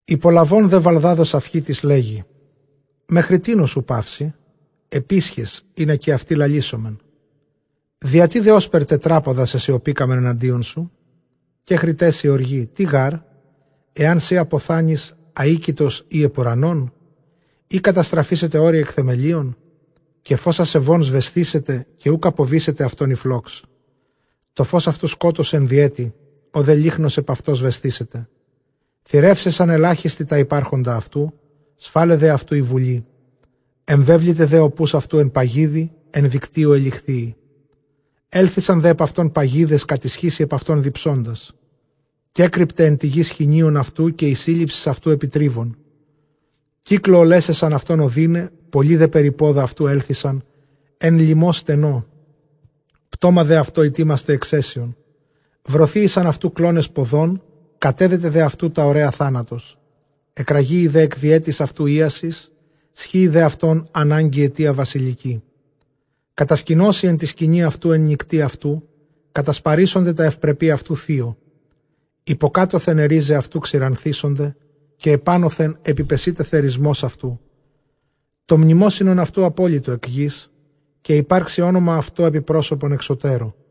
Ὑπολαβὼν δὲ Βαλδὰδ ὁ Σαυχίτης, λέγει, Μέχρι τίνος οὐ παύσῃ; ἐπίσχες, ἵνα καὶ αὐτοὶ λαλήσωμεν. Διατί δὲ ὥσπερ τετράποδα σεσιωπήκαμεν ἐναντίον σου; Κέχρηταί σοι ὀργή· τί γὰρ ἐὰν σὺ ἀποθάνῃς, ἀοίκητος ἡ ὑπʼ οὐρανόν; ἢ καταστραφήσεται ὄρη ἐκ θεμελίων; Καὶ φῶς ἀσεβῶν σβεσθήσεται, καὶ οὐκ ἀποβήσεται αὐτῶν ἡ φλόξ. Τὸ φῶς αὐτοῦ σκότος ἐν διαίτῃ, ὁ δὲ λύχνος ἐπʼ αὐτῷ σβεσθήσεται. Θηρεύσαισαν ἐλάχιστοι τὰ ὑπάρχοντα αὐτοῦ· σφάλαι δὲ αὐτοῦ ἡ βουλή. Ἐμβέβληται δὲ ὁ ποῦς αὐτοῦ ἐν παγίδι, ἐν δικτύῳ ἑλιχθείη. Ἔλθοισαν δὲ ἐπʼ αὐτὸν παγίδες, κατισχύσει ἐπʼ αὐτὸν διψῶντας. Κέκρυπται ἐν τῇ γῇ σχοινίον αὐτοῦ, καὶ ἡ σύλληψις αὐτοῦ ἐπὶ τρίβον. Κύκλῳ ὀλέσαισαν αὐτὸν ὀδύναι· πολλοὶ δὲ περὶ πόδα αὐτοῦ ἔλθοισαν ἐν λιμῷ στενῷ· πτῶμα δὲ αὐτῷ ἡτοίμασται ἐξαίσιον. Βρωθείησαν αὐτοῦ κλῶνες ποδῶν, κατέδεται δὲ αὐτοῦ τὰ ὡραῖα θάνατος. Ἐκραγείη δέ ἐκ διαίτης αὐτοῦ ἴασις, σχοίη δὲ αὐτὸν ἀνάγκη αἰτίᾳ βασιλικῇ. Κατασκηνώσει ἐν τῇ σκηνῇ αὐτοῦ ἐν νυκτὶ αὐτοῦ, κατασπαρήσονται τὰ εὐπρεπῆ αὐτοῦ θείῳ. Ὑποκάτωθεν αἱ ῥίζαι αὐτοῦ ξηρανθήσονται, καὶ ἐπάνωθεν ἐπιπεσεῖται θερισμὸς αὐτοῦ. Τὸ μνημόσυνον αὐτοῦ ἀπόλοιτο ἐκ γῆς, καὶ ὑπάρξει ὄνομα αὐτῷ ἐπὶ πρόσωπον ἐξωτέρω.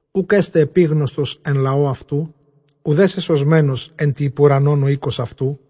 Οὐκ ἔσται ἐπίγνωστος ἐν λαῷ αὐτοῦ, οὐδὲ σεσωσμένος ἐν τῇ ὑπʼ οὐρανὸν ὁ οἶκος αὐτοῦ.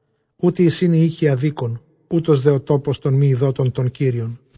Οὗτοί εἰσιν οἱ οἶκοι ἀδίκων, οὗτος δὲ ὁ τόπος τῶν μὴ εἰδότων τὸν Κύριον.